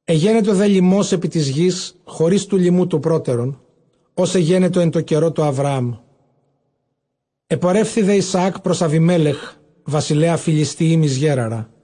Ἐγένετο δὲ λιμὸς ἐπὶ τῆς γῆς, χωρὶς τοῦ λιμοῦ τοῦ πρότερον, ὃς ἐγένετο ἐν τῷ καιρῷ τοῦ Ἁβραάμ· ἐπορεύθη δὲ Ἰσαὰκ πρὸς Ἀβιμέλεχ βασιλέα Φυλιστιεὶμ εἰς Γέραρα.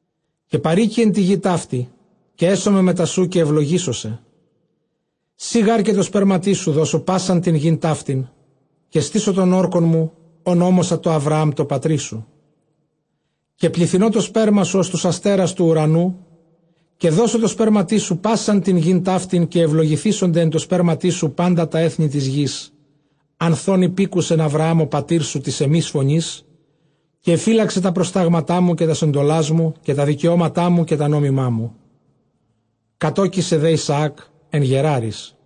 Καὶ παροίκει ἐν τῇ γῇ ταύτῃ, καὶ ἔσομαι μετὰ σοῦ, καὶ εὐλογήσω σε· σοὶ γὰρ καὶ τῷ σπέρματί σου δώσω πᾶσαν τὴν γῆν ταύτην· καὶ στήσω τὸν ὅρκον μου, ὅν ὤμοσα τῷ Ἁβραὰμ τῷ πατρί σου. Καὶ πληθυνῶ τὸ σπέρμα σου, ὡς τοὺς ἀστέρας τοῦ οὐρανοῦ· καὶ δώσω τῷ σπέρματί σου πᾶσαν τὴν γῆν ταύτην· καὶ εὐλογηθήσονται ἐν τῷ σπέρματί σου πάντα τὰ ἔθνη τῆς γῆς. Ἀνθʼ ὧν ὑπήκουσεν Ἁβραὰμ ὁ πατήρ σου τῆς ἐμῆς φωνῆς, καὶ ἐφύλαξε τὰ προστάγματά μου, καὶ τὰς ἐντολάς μου, καὶ τὰ δικαιώματά μου, καὶ τὰ νόμιμά μου. Κατῴκησε δὲ Ἰσαὰκ ἐν Γεράροις.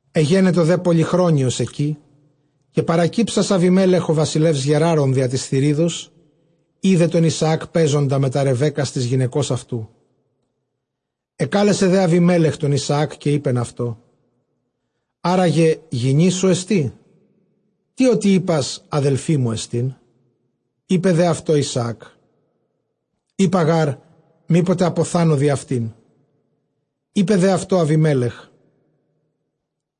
Ἐγένετο δὲ πολυχρόνιος ἐκεῖ· καὶ παρακύψας Ἀβιμέλεχ ὁ βασιλεὺς Γεράρων διὰ τῆς θυρίδος, εἶδε τὸν Ἰσαὰκ παίζοντα μετὰ Ῥεβέκκας τῆς γυναικὸς αὐτοῦ. Ἐκάλεσε δὲ Ἀβιμέλεχ τὸν Ἰσαὰκ, καὶ εἶπεν αὐτῷ, ἆρά γε γυνή σου ἐστί; τί ὅτι εἶπας, ἀδελφή μου ἐστίν; εἶπε δὲ αὐτῷ Ἰσαὰκ, εἶπα γὰρ, μή ποτε ἀποθάνω διʼ αὐτήν. Εἶπε δὲ αὐτῷ Ἀβιμέλεχ,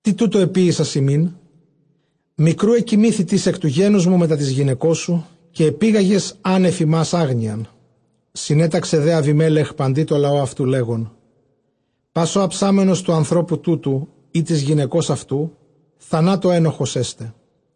τί τοῦτο ἐποίησας ἡμῖν; μικροῦ ἐκοιμήθη τις ἐκ τοῦ γένους μου μετὰ τῆς γυναικός σου, καὶ ἐπήγαγες ἂν ἐφʼ ἡμᾶς ἄγνοιαν. Συνέταξε δὲ Ἀβιμέλεχ παντὶ τῷ λαῷ αὐτοῦ, λέγων, πᾶς ὁ ἁψάμενος τοῦ ἀνθρώπου τούτου καὶ τῆς γυναικὸς αὐτοῦ, θανάτῳ ἔνοχος ἔσται.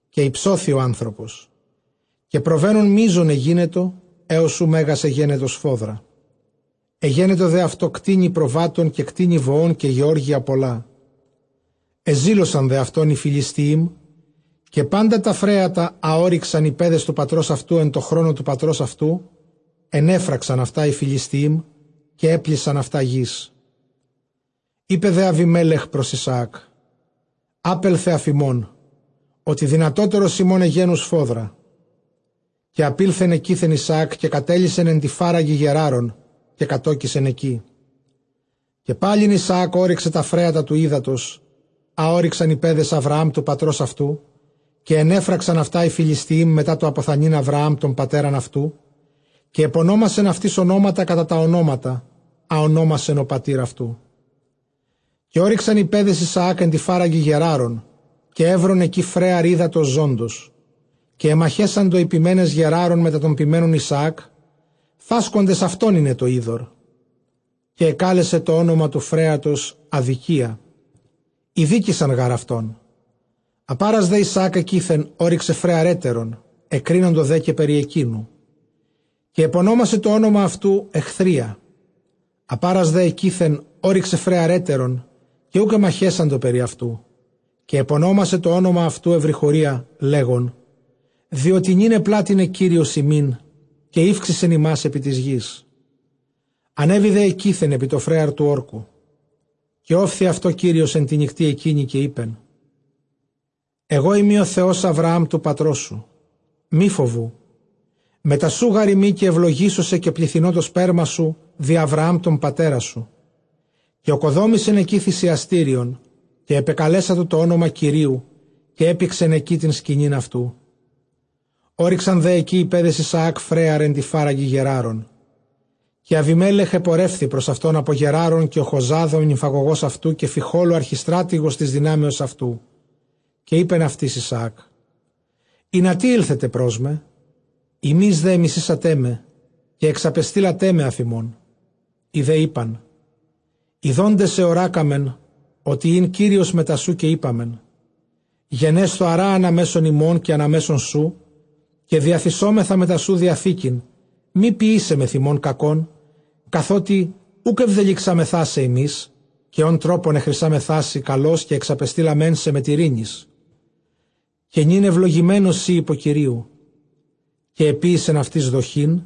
Καὶ ὑψώθη ὁ ἄνθρωπος, καὶ προβαίνων μείζων ἐγένετο, ἕως οὗ μέγας ἐγένετο σφόδρα. Ἐγένετο δὲ αὐτῷ κτήνη προβάτων, καὶ κτήνη βοῶν, καὶ γεώργια πολλά. ἐζήλωσαν δὲ αὐτὸν οἱ Φυλιστιείμ. Καὶ πάντα τὰ φρέατα, ἃ ὤρυξαν οἱ παῖδες τοῦ πατρὸς αὐτοῦ ἐν τῷ χρόνῳ τοῦ πατρὸς αὐτοῦ, ἐνέφραξαν αὐτὰ οἱ Φυλιστιεὶμ, καὶ ἔπλησαν αὐτὰ γῆς. Εἶπε δὲ Ἀβιμέλεχ πρὸς Ἰσαὰκ, ἄπελθε ἀφʼ ἡμῶν, ὅτι δυνατώτερος ἡμῶν ἐγένου σφόδρα. Καὶ ἀπῆλθεν ἐκεῖθεν Ἰσαάκ· καὶ κατέλυσεν ἐν τῇ φάραγγι Γεράρων, καὶ κατῴκησεν ἐκεῖ. Καὶ πάλιν Ἰσαὰκ ὤρυξε τὰ φρέατα τοῦ ὕδατος, ἃ ὤρυξαν οἱ παῖδες Ἁβραὰμ τοῦ πατρὸς αὐτοῦ, καὶ ἐνέφραξαν αὐτὰ οἱ Φυλιστιεὶμ μετὰ τὸ ἀποθανεῖν Ἁβραὰμ τὸν πατέρα αὐτοῦ· καὶ ἐπωνόμασεν αὐτοῖς ὀνόματα κατὰ τὰ ὀνόματα, ἃ ὠνόμασεν ὁ πατὴρ αὐτοῦ. Καὶ ὤρυξαν οἱ παῖδες Ἰσαὰκ ἐν τῇ φάραγγι Γεράρων· καὶ εὗρον ἐκεῖ φρέαρ ὕδατος ζῶντος. Καὶ ἐμαχέσαντο οἱ ποιμένες Γεράρων μετὰ τῶν ποιμένων Ἰσαὰκ, φάσκοντες αὐτῶν εἶναι τὸ ὕδωρ· καὶ ἐκάλεσαν τὸ ὄνομα τοῦ φρέατος, Ἀδικία· ἠδίκησαν γὰρ αὐτόν. Ἀπᾴρας δὲ ἐκεῖθεν ὤρυξε φρέαρ ἕτερον· ἐκρίνοντο δὲ καὶ περὶ ἐκείνου· καὶ ἐπωνόμασε τὸ ὄνομα αὐτοῦ, Ἐχθρία. Ἀπᾴρας δὲ ἐκεῖθεν ὤρυξε φρέαρ ἕτερον· καὶ οὐκ ἐμαχέσαντο περὶ αὐτοῦ· καὶ ἐπωνόμασε τὸ ὄνομα αὐτοῦ, Εὐρυχωρία, λέγων, διότι νῦν ἐπλάτυνε Κύριος ἡμῖν, καὶ ηὔξησεν ἡμᾶς ἐπὶ τῆς γῆς. Ἀνέβη δὲ ἐκεῖθεν ἐπὶ τὸ φρέαρ τοῦ ὅρκου. Καὶ ὤφθη αὐτῷ Κύριος ἐν τῇ νυκτὶ ἐκείνῃ, καὶ εἶπεν, ἐγώ εἰμι ὁ Θεὸς Ἁβραὰμ τοῦ πατρός σου· μὴ φοβοῦ, μετὰ σοῦ γάρ εἰμι, καὶ εὐλογήσω σε, καὶ πληθυνῶ τὸ σπέρμα σου διʼ Ἁβραὰμ τὸν πατέρα σου. Καὶ ᾠκοδόμησεν ἐκεῖ θυσιαστήριον, καὶ ἐπεκαλέσατο τὸ ὄνομα Κυρίου, καὶ ἔπηξεν ἐκεῖ τὴν σκηνὴν αὐτοῦ· ὤρυξαν δὲ ἐκεῖ οἱ παῖδες Ἰσαὰκ φρέαρ ἐν τῇ φάραγγι Γεράρων. Καὶ Ἀβιμέλεχ ἐπορεύθη πρὸς αὐτὸν ἀπὸ Γεράρων, καὶ Ὁχοζὰθ ὁ νυμφαγωγὸς αὐτοῦ, καὶ Φιχὼλ ὁ ἀρχιστράτηγος τῆς δυνάμεως αὐτοῦ. Καὶ εἶπεν αὐτοῖς Ἰσαὰκ, ἵνα τί ἤλθετε πρός με; ὑμεῖς δὲ ἐμισήσατέ με, καὶ ἐξαπεστείλατέ με ἀφʼ ὑμῶν. Οἱ δὲ εἶπαν, ἰδόντες ἑωράκαμεν ὅτι ἦν Κύριος μετὰ σοῦ· καὶ εἴπαμεν, γενέσθω ἀρὰ ἀνὰ μέσον ἡμῶν καὶ ἀνὰ μέσον σου, καὶ διαθησόμεθα μετὰ σοῦ διαθήκην, Μὴ ποιήσαι μεθʼ ἡμῶν κακὸν, καθότι οὐκ ἐβδελυξάμεθά σε ἡμεῖς, καὶ ὃν τρόπον ἐχρησάμεθά σοι καλῶς, καὶ ἐξαπεστείλαμέν σε μετʼ εἰρήνης· καὶ νῦν εὐλογημένος σὺ ὑπὸ Κυρίου. Καὶ ἐποίησεν αὐτοῖς δοχὴν,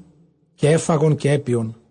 καὶ ἔφαγον καὶ ἔπιον.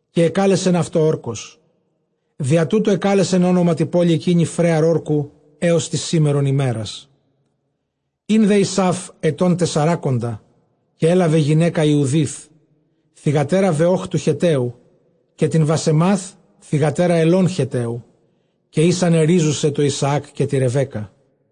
Καὶ ἐκάλεσεν αὐτὸ, Ὅρκος· διὰ τοῦτο ἐκάλεσεν ὄνομα τῇ πόλει ἐκείνῃ, Φρέαρ Ὅρκου, ἕως τῆς σήμερον ἡμέρας. Ἦν δὲ Ἡσαῦ ἐτῶν τεσσαράκοντα, καὶ ἔλαβε γυναῖκα Ἰουδὶθ, θυγατέρα Βεὼχ τοῦ Χετταίου, καὶ τὴν Βασεμὰθ, θυγατέρα Ἑλὼν Χετταίου. Καὶ ἦσαν ἐρίζουσαι τῷ Ἰσαὰκ καὶ τῇ Ῥεβέκκᾳ.